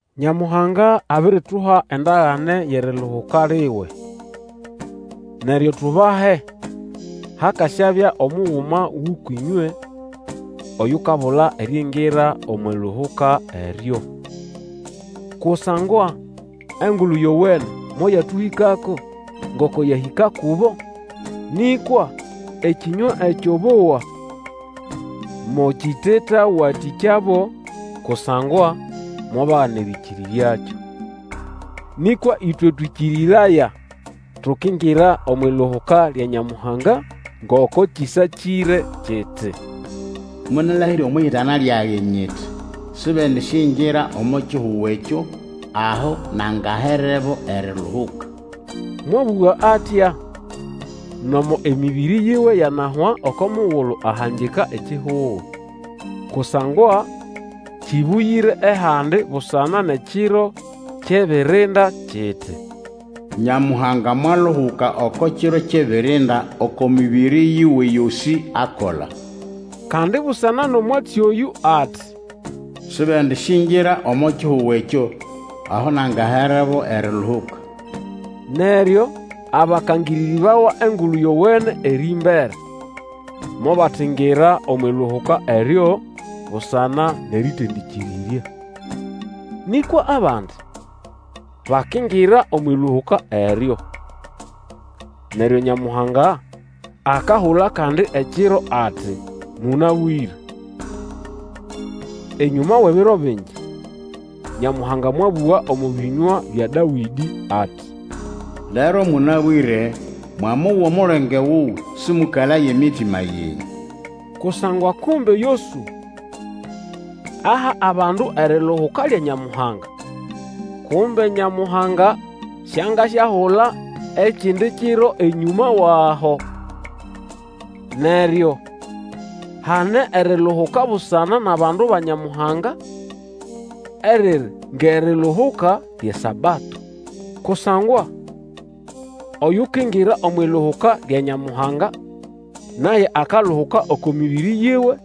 Nyamuhanga abirituha endagane yʼeriluhuka liwe. Neryo tubahe hakasyabya omuguma gʼũkwʼĩnywe oyukabula eriingira omwʼiluhuka eryo. Kusangwa Engulu Yowene moyatũhĩkako ngoko yahĩka kubo; nĩkwa ekĩnywa ekyo bowa mokitetawatĩkyabo kusangwa mobagana erĩkĩrĩryakyo. Nĩkwa ĩtwe twĩkĩrĩraya tukingira omwʼiluhuka lya Nyamuhanga; ngoko kĩsakĩre kiti, Monalahĩrya omwʼihitana lyage nyiti, Sibendisyingira omo kihugo ekyo aho nangaherebo eriluhuka. Mwabũga atya nomo emĩbĩrĩ yiwe yanahwa oko mugulu ahangika ekihugo. Kusangwa kĩbũgĩre ehandi busana nʼekiro kyʼebirinda kiti, Nyamuhanga mwaluhuka oko kiro kyʼebirinda oko mĩbĩrĩ yiwe yosĩ akola. Kandi busana nʼomwatsi oyũ ati, Sibendisyingira omo kihugo ekyo aho nangaherebo eriluhuka. Neryo abakangĩrĩrĩbawa Engulu Yowene erĩmbere mobatingira omwʼiluhuka eryo busana nʼerĩtendĩkĩrĩrya. Nĩkwa abandi bakingira omwʼiluhuka eryo. Neryo Nyamuhanga akahula kandi ekiro ati, Mũnabwĩre. Enyũma wʼebiro bingi Nyamuhanga mwabũga omo bĩnywa bya Dawĩdĩ ati, Lero mũnabwĩre, mwamowa omulenge wuwe, Sĩmũkalaye emitima yenyũ. Kusangwa kumbe Yosũa aha abandu eriluhuka lya Nyamuhanga, kumbe Nyamuhanga siangasyahula ekindi kiro enyũma wʼaho. Neryo hane eriluhuka busana nʼabandu ba Nyamuhanga eriri ngʼeriluhuka lyʼeSabato. Kusangwa oyukingira omwʼiluhuka lya Nyamuhanga naye akaluhuka oko mĩbĩrĩ yiwe,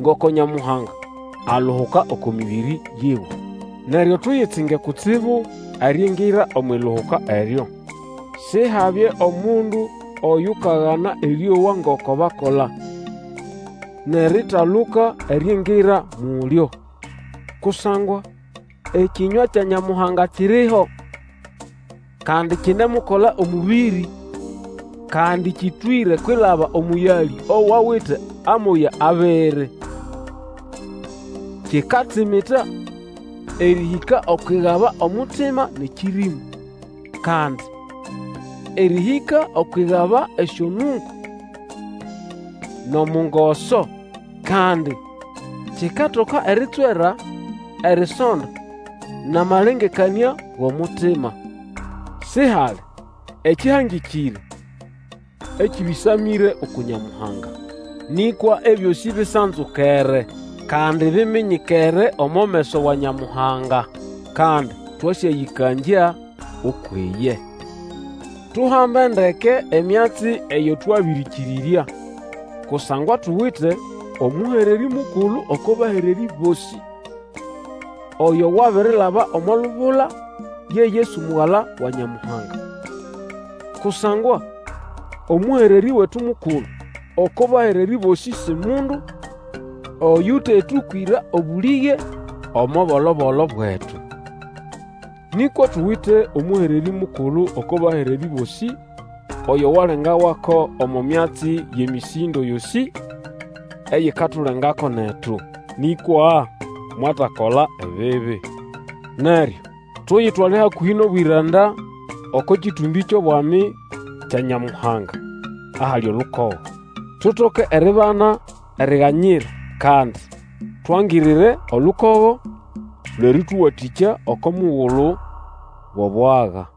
ngoko Nyamuhanga aluhuka oko mĩbĩrĩ yiwe. Neryo tuyitsinge kutsibu eriingira omwʼiluhuka eryo. Sihabye omundu oyukagana erĩowa ngoko bakola, nʼeritaluka eriingira mulyo. Kusangwa ekĩnywa kya Nyamuhanga kiriho, kandi kinemukola omũbĩrĩ, kandi kĩtwĩre kwilaba omũyalĩ owawite amoya abiri. Kikatsimita erĩhĩka okwʼigaba omutima nʼekĩrĩmu; kandi erĩhĩka okwʼigaba esyonungo nʼomungoso. Kandi kikatoka eritswera erisonda nʼamalengekanĩa gʼomutima. Sihali ekĩhangĩkĩre ekĩbĩsamĩre uku Nyamuhanga. Nĩkwa ebyosĩ bisanzukere, kandi biminyikere omo meso wa Nyamuhanga. Kandi twasyayĩbalya ukwʼiye. Tuhambe ndeke emyatsi eyo twabĩrĩkĩrĩrya, kusangwa tuwite omũhererĩ mukulu oko bahererĩ bosĩ, oyo wabirilaba omo lubula, Ye Yesu Mugala wa Nyamuhanga. Kusangwa omũhererĩ wetu mukulu oko bahererĩ bosĩ si mundu oyũtetũkwĩra obũlĩge omo bolo-bolo bwetu. Nĩkwa tuwite omũhererĩ mukulu oko bahererĩ bosĩ oyo walengawako omo myatsi yʼemĩsĩndo yosĩ eyikatulengako netu, nĩkwa mwatakola ebibi. Neryo tuyitwale hakũhĩ nʼobwĩranda oko kĩtũmbĩ kyʼobwami kya Nyamuhanga, ahali olukogo. Tutoke eribana eriganyira, kandi twangirire olukogo lwʼerĩtũwatĩkya oko mugulu wʼobwaga.